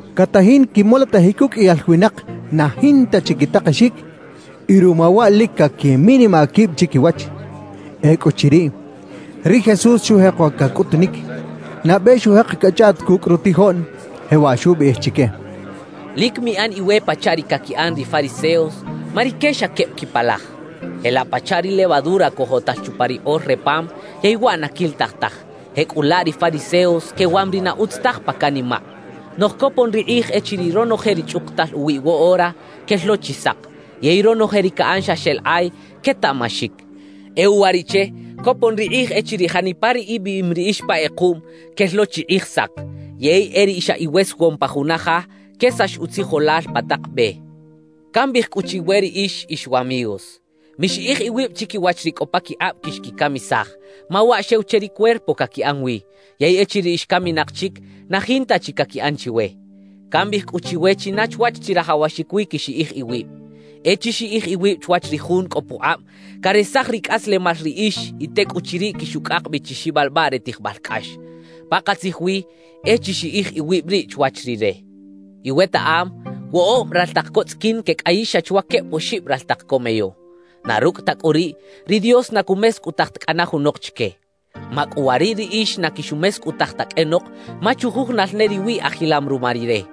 Catajin quimolotajic uqꞌuiyal winak na jinta chi quitakexic, y ruma waꞌ lic caquiminimaꞌ quib chiquiwach. Ecꞌuchiriꞌ, ri Jesús xujeko cacꞌutunic; nabe xujek cachꞌaꞌt cucꞌ rutijoꞌn, jewaꞌ xubiꞌij chique: «Lic miꞌan iwe pachaꞌ ri caquiꞌan ri fariseos, ma rique xa queb quipalaj. Jelaꞌ pachaꞌ ri levadura cojotal chupa ri kꞌor re pam yey waꞌ na quilitaj taj, jecꞌulaꞌ ri fariseos quewam ri na utz taj pa canimaꞌ. Noꞌj copon ri kꞌij echiriꞌ ronoje ri chꞌukutal uwiꞌ woꞌora, quel lo chi sak; yey ronoje ri caꞌan xa xeꞌlakꞌay, quetaꞌmaxic. E uwariꞌche copon ri kꞌij echiriꞌ janipa ri ibiꞌim riꞌix pa kꞌekuꞌm, quel lo chi kꞌij sak; yey e ri xa iwesewoꞌm pa juna ja, quesax utzijolal pa tak be. »Cambiꞌij cꞌu chiwe riꞌix ix wamigos: Mixiꞌij iwib chiquiwach ri cꞌo paquikꞌab quixquicamisaj, ma waꞌ xew che ri cuerpo caquiꞌan wi; yey echiriꞌ ix caminak chic, na jinta chi caquiꞌan chiwe. Cambiꞌij cꞌu chiwe china chwach chirajawaxic wi quixiꞌij iwib: E chixiꞌij iwib chwach ri Jun cꞌo pukꞌab caresaj ricꞌaslemal riꞌix y tecꞌuchiriꞌ quixucꞌak bi chi xibalbaꞌ re tijbal cꞌax. Pakatzij wi e chixiꞌij iwib riꞌ chwach Rire. »Iwetaꞌam woꞌob raltak co tzꞌiquin quecꞌayix xa chwa queb oxib raltak co meyo. Na rucꞌ ta cꞌu riꞌ, ri Dios na cumescꞌutaj ta cꞌana junok chique. Macꞌuwariꞌ riꞌix na quixumescꞌutaj ta qꞌuenok, ma chujujunal ne riwiꞌ ajilam ruma Rire.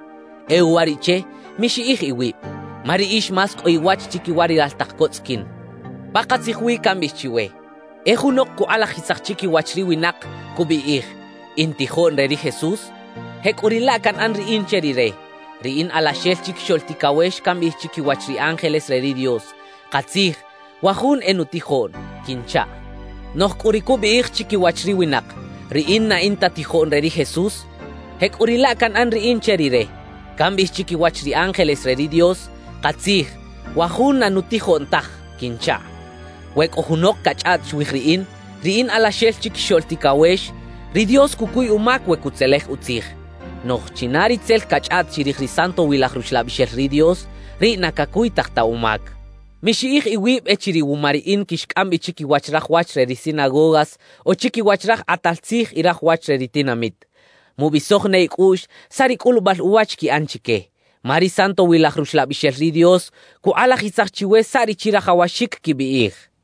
E uwariꞌche, mixiꞌij iwib; ma riꞌix más cꞌo iwach chiquiwa ri raltak co tzꞌiquin. »Pakatzij wi cambiꞌij chiwe: E junok cukꞌalajisaj chiquiwach ri winak, cubiꞌij: “In tijoꞌn re ri Jesús”, jecꞌuriꞌlaꞌ canꞌan riꞌin che rire; ri in Alaxel Chiquixoꞌl Ticawex cambiꞌij chiquiwach ri ángeles re ri Dios: “Katzij, wa jun e nutijoꞌn” quinchaꞌ. Noꞌj cꞌu ri cubiꞌij chiquiwach ri winak: “Riꞌin na in ta tijoꞌn re ri Jesús”, jecꞌuriꞌlaꞌ canꞌan riꞌin che rire; cambiꞌij chiquiwach ri ángeles re ri Dios: “Katzij, wa jun na nutijoꞌn taj” quinchaꞌ. »We cꞌo junok cachꞌaꞌt chwij riꞌin, ri in Alaxel Chiquixoꞌl Ticawex, ri Dios cucuy umac we cutzelej utzij. Noꞌj china ri tzel cachꞌaꞌt chirij ri Santowilaj Ruxlabixel ri Dios, riꞌ na cacuytaj ta umac. »Mixiꞌij iwib echiriꞌ wuma riꞌin quixcꞌam bi chiquiwach raj wach re ri sinagogas o chiquiwach raj kꞌatal tzij y raj wach re ri tinamit; mubisoj ne icꞌuꞌx saꞌ ri cꞌulubal uwach quiꞌan chique, ma ri Santowilaj Ruxlabixel ri Dios cukꞌalajisaj chiwe saꞌ ri chirajawaxic quibiꞌij» xcha ri Jesús.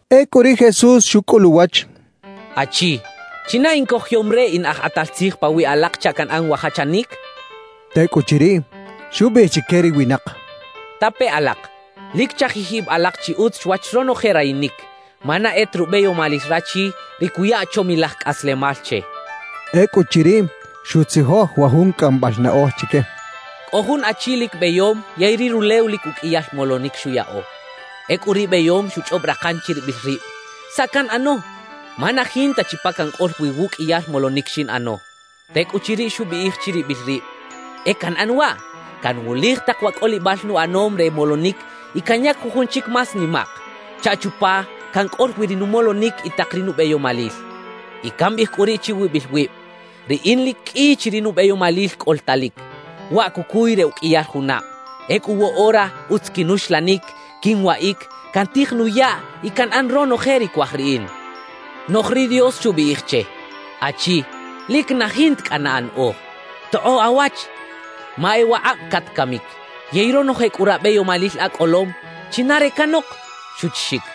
Ecꞌu ri Jesús xucꞌul uwach: —Achi, ¿china incojoyom re in aj kꞌatal tzij pawiꞌ alak chaꞌ canꞌan wa jachanic? —xchaꞌ. Tecꞌuchiriꞌ, xubiꞌij chique ri winak: —Tape alak, lic chajij ib alak chi utz chwach ronoje rayinic, ma na e ta rubeyomalil rachi ri cuya chomilaj cꞌaslemal che —xchaꞌ. Ecꞌuchiriꞌ xutzijoj wa jun cꞌambal naꞌoj chique: «Cꞌo jun achi lic beyom yey ri rulew lic uqꞌuiyal molonic xuyaꞌo. Ecꞌu ri beyom xuchꞌob rakan chiribil rib: “¿Saꞌ canꞌano? Ma na jinta chi pa cancꞌol wi wuꞌqꞌuiyal molonic xinꞌano.” »Tecꞌuchiriꞌ xubiꞌij chiribil rib: “E canꞌan waꞌ: Canwulij tak wa cꞌolibal nuꞌanom re molonic y canyac jujun chic más nimaꞌk, chaꞌ chupa cancꞌol wi ri numolonic y tak ri nubeyomalil. Y cambiꞌij cꞌu riꞌ chiwibil wib: Riꞌin lic qꞌui chi ri nubeyomalil cꞌoltalic, waꞌ cucuy re uqꞌuiyal junab. Ecꞌu woꞌora utz quinuxlanic, quinwaꞌic, cantij nuyaꞌ y canꞌan ronoje ri cuaj riꞌin.” »Noꞌj ri Dios xubiꞌij che: “Achi, lic na jinta cꞌana anaꞌoj. ¡Tokꞌoꞌ awach! Ma e wakꞌab catcamic; yey ronoje cꞌu rabeyomalil acꞌolom, ¿china re canok?” xuchixic.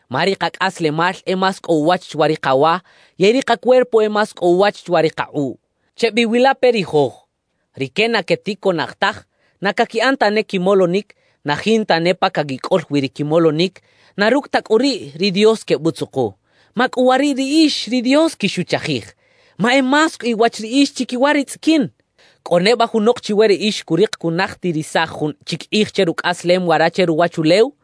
Ma ri kacꞌaslemal e más cꞌo uwach chwa ri kawa, yey ri kacuerpo e más cꞌo uwach chwa ri kakꞌuꞌ. »Chebiwilape ri joj. Rique na queticoꞌnaj taj, na caquiꞌan tane quimolonic, na jinta ne pa caquicꞌol wi ri quimolonic; na rucꞌ ta cꞌu riꞌ ri Dios quebutzuku. ¡Macꞌuwariꞌ riꞌix, ri Dios quixuchajij! ¡Ma e más cꞌo iwach riꞌix chiquiwa ri tzꞌiquin! »¿Cꞌo neba junok chiwe riꞌix curik cunajtirisaj jun chic kꞌij che rucꞌaslem wara che ruwachulew?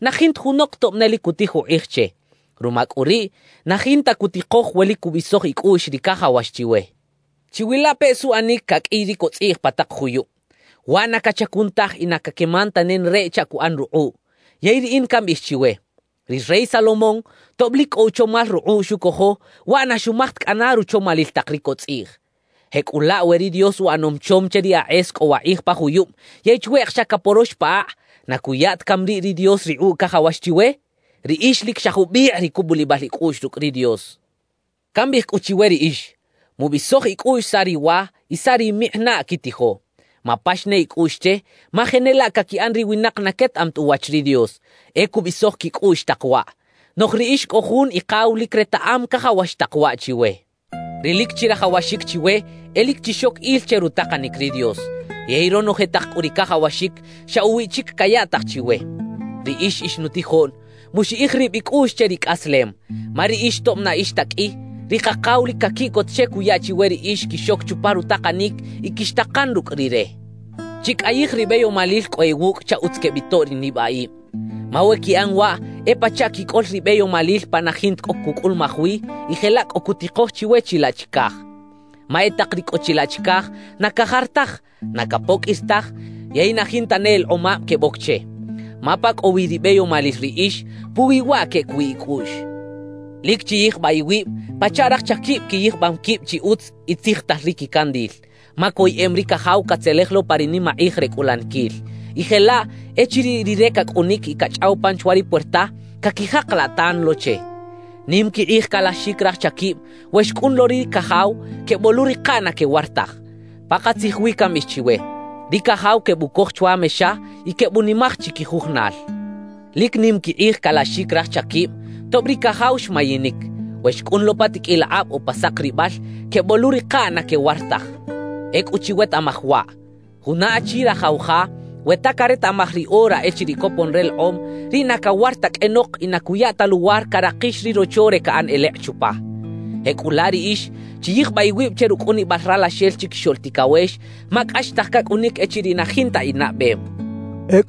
Na jinta junok tob ne lic cutij ukꞌij che. Ruma cꞌu riꞌ, na jinta cutikoj we lic cubisoj icꞌuꞌx ri cajawax chiwe. »Chiwilapeꞌ suꞌanic caqꞌuiy ri cotzꞌiꞌj pa tak juyub. Waꞌ na cachacun taj y na caqueman ta nenareꞌ chaꞌ cuꞌan rukꞌuꞌ. Yey riꞌin cambiꞌij chiwe: Ri rey Salomón, tob lic cꞌo uchomal rukꞌuꞌ xucojo, waꞌ na xumaj ta cꞌana ruchomalil tak ri cotzꞌiꞌj. Jecꞌulaꞌ we ri Dios uꞌanom chom che ri akꞌes cꞌo wakꞌij pa juyub yey chweꞌk xa caporox pa akꞌ, ¿na cuya ta cami riꞌ ri Dios rikꞌuꞌ cajawax chiwe? ¡Riꞌix lic xa jubikꞌ ri cubulibal icꞌuꞌx rucꞌ ri Dios! »Cambiꞌij cꞌu chiwe riꞌix: Mubisoj icꞌuꞌx saꞌ riwa y saꞌ rimikꞌinaꞌ quitijo. Mapax ne icꞌuꞌx che, ma jenelaꞌ caquiꞌan ri winak na quetaꞌam ta uwach ri Dios, e cubisoj quicꞌuꞌx tak waꞌ. Noꞌj riꞌix cꞌo jun Ikaw lic retaꞌam cajawax tak waꞌ chiwe. Ri lic chirajawaxic chiwe e lic chixoc il che rutakanic ri Dios; yey ronoje tak cꞌu ri cajawaxic, xa uwiꞌ chic cayaꞌtaj chiwe. »Riꞌix ix nutijoꞌn, muxiꞌij rib icꞌuꞌx che ricꞌaslem, ma riꞌix tob na ix ta qꞌui, ri Kakaw lic caquiꞌcot che cuya chiwe riꞌix quixoc chupa rutakanic y quixtakan rucꞌ Rire. Chicꞌayij ri beyomalil cꞌo iwucꞌ chaꞌ utz quebitoꞌ ri nibaꞌib. Ma we quiꞌan waꞌ, e pachaꞌ quicꞌol ribeyomalil pa na jinta cꞌo cucꞌulumaj wi y jelaꞌ cꞌo cutikoj chiwe chilaꞌ chicaj. Ma e tak ri cꞌo chilaꞌ chicaj na cajar taj, na capoqꞌuir taj, yey na jinta ne elekꞌomab queboc che. Ma pa cꞌo wi ribeyomalil riꞌix, puwi waꞌ queꞌec wi icꞌuꞌx. »Lic chiyijbaꞌ iwib, pachaꞌ raj chaquib quiyijbam quib chi utz y tzijtal ri quicandil, ma coyeꞌem ri cajaw catzelej lo pa ri nimakꞌij re cꞌulaniquil. Y jelaꞌ echiriꞌ rire cacꞌunic y cachꞌaw pan chwa ri puerta, caquijakalaꞌ tan lo che. Nim quikꞌij calaxic raj chaquib we xcꞌun lo ri cajaw, queboluꞌrikaꞌ na quewar taj. Pakatzij wi cambiꞌij chiwe, ri cajaw quebucoj chwa mexa y quebunimaj chiquijujunal. Lic nim quikꞌij calaxic raj chaquib, tob ri cajaw xmayinic, we xcꞌun lo pa tiqꞌuil akꞌab o pa sakribal, queboluꞌrikaꞌ na quewar taj. Ecꞌu chiwetaꞌmaj waꞌ: Juna achi rajaw ja, we ta caretaꞌmaj ri ora echiriꞌ copon relekꞌom, riꞌ na cawar ta qꞌuenok y na cuya ta luwar carakix ri rocho re caꞌan elekꞌ chupa. Jecꞌulaꞌ riꞌix chiyijbaꞌ iwib che rucꞌunibal Ralaxel Chiquixoꞌl Ticawex, ma cꞌaxtaj cacꞌunic echiriꞌ na jinta inaꞌbem» xchaꞌ.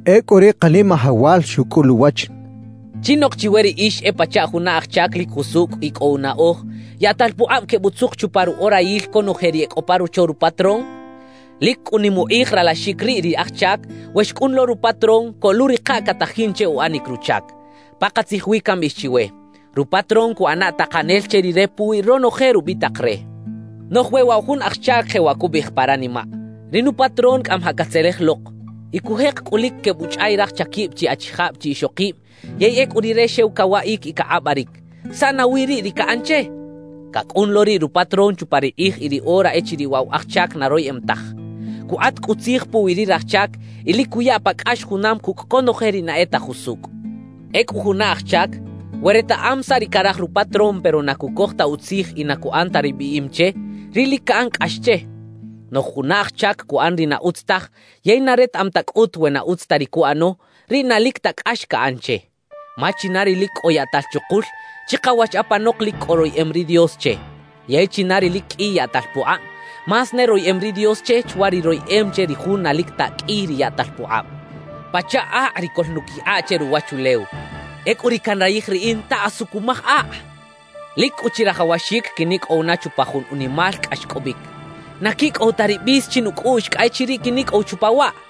Ecꞌu ri Kanimajawal xucꞌul uwach: «¿Chinok chiwe riꞌix e pachaꞌ juna aj chac lic jusucꞌ y cꞌo unaꞌoj, yaꞌtal pukꞌab quebutzuk chupa ruꞌorayil conoje ri e cꞌo pa rocho rupatrón? Lic cꞌu nim ukꞌij ralaxic riꞌ ri aj chac, we xcꞌun lo rupatrón, coluꞌrikaꞌ catajin che uꞌanic ruchac. Pakatzij wi cambiꞌij chiwe: Rupatrón cuꞌana takanel che rire puwi ronoje rubitak re. »Noꞌj we waꞌ wa jun aj chac jewaꞌ cubiꞌij pa ranimaꞌ: “Ri nupatrón cꞌamajaꞌ catzelej lok” y cujek cꞌu lic quebuchꞌay raj chaquib chi achijab chi ixokib; yey ecꞌu rire xew cawaꞌic y cakꞌabaric, ¿saꞌ nawi riꞌ ri caꞌan che? Cacꞌun lo riꞌ rupatrón chupa ri kꞌij y ri ora echiriꞌ waꞌ wa aj chac na royeꞌem taj. Cukꞌat cꞌu tzij puwi ri raj chac y lic cuya pa cꞌax junam cucꞌ conoje ri na e ta jusucꞌ. »Ecꞌu juna aj chac, we retaꞌam saꞌ ri caraj rupatrón pero na cucoj ta utzij y na cuꞌan ta ri biꞌim che, riꞌ lic caꞌan cꞌax che. Noꞌj juna aj chac cuꞌan ri na utz taj yey na retaꞌam ta cꞌut we na utz ta ri cuꞌano, riꞌ na lic ta cꞌax caꞌan che. Ma china ri lic cꞌo yaꞌtal chukul, chikawach apanok lic cꞌo royeꞌem ri Dios che; yey china ri lic qꞌui yaꞌtal pukꞌab, más ne royeꞌem ri Dios che chwa ri royeꞌem che ri jun na lic ta qꞌui ri yaꞌtal pukꞌab. »Pachaꞌ akꞌ ri coꞌlnuquikꞌa che ruwachulew. ¡Ecꞌu ri canrayij riꞌin ta asu cumaj akꞌ! Lic cꞌu chirajawaxic quinicꞌow na chupa jun unimal cꞌaxcꞌobic. ¡Na quicꞌow ta ri bis chinucꞌuꞌx, cꞌa echiriꞌ quinicꞌow chupa waꞌ!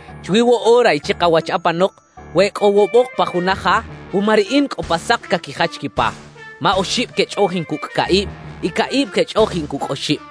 Chwi woꞌora y chikawach apanok we e cꞌo woꞌobok pa juna ja, wuma riꞌin cꞌo pa sak caquijach quipa; ma oxib quechꞌoꞌjin cucꞌ caꞌib y caꞌib quechꞌoꞌjin cucꞌ oxib.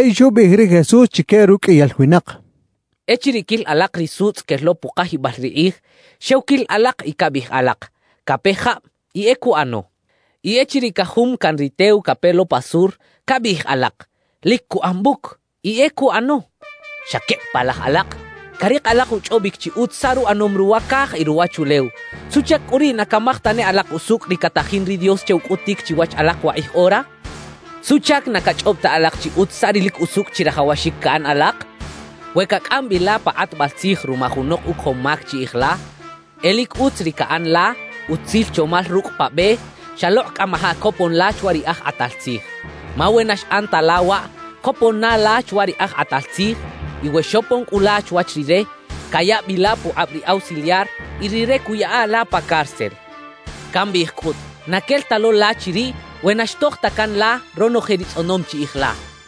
Yey xubiꞌij ri Jesús chique ruqꞌuiyal winak: «Echiriꞌ quil alak ri sutzꞌ quel lo pukajibal ri kꞌij, xew quil alak y cabiꞌij alak: “Cape jab” y e cuꞌano. Y echiriꞌ cajum caꞌn ri tew cape lo pa sur, cabiꞌij alak: “Lic cuꞌan buc” y e cuꞌano. ¡Xa queb palaj alak! Carik alak uchꞌobic chi utz saꞌ ruꞌanom ruwa caj y ruwachulew; ¿suꞌchac cꞌu riꞌ na camaj tane alak usucꞌ ri catajin ri Dios che ucꞌutic chiwach alak wakꞌij ora? »¿Suꞌchac na cachꞌob ta alak chi utz saꞌ ri lic usucꞌ chirajawaxic caꞌan alak? We cacꞌam bi la pa kꞌatbal tzij ruma junok ucojom mac chiꞌij la, e lic utz ri caꞌan la utzil chomal rucꞌ pa be xalokꞌ cꞌamajaꞌ copon la chwa ri aj kꞌatal tzij. Ma we na xꞌan ta la waꞌ, copon na la chwach ri aj kꞌatal tzij. Y we xopon cꞌu la chwach rire, cayaꞌ bi la pukꞌab ri ausiliar y rire cuꞌyaꞌa la pa cárcel. Cambiꞌij cꞌut, na quel ta lo la chiriꞌ we na xtoj ta can la ronoje ri tzꞌonom chiꞌij la» xcha ri Jesús.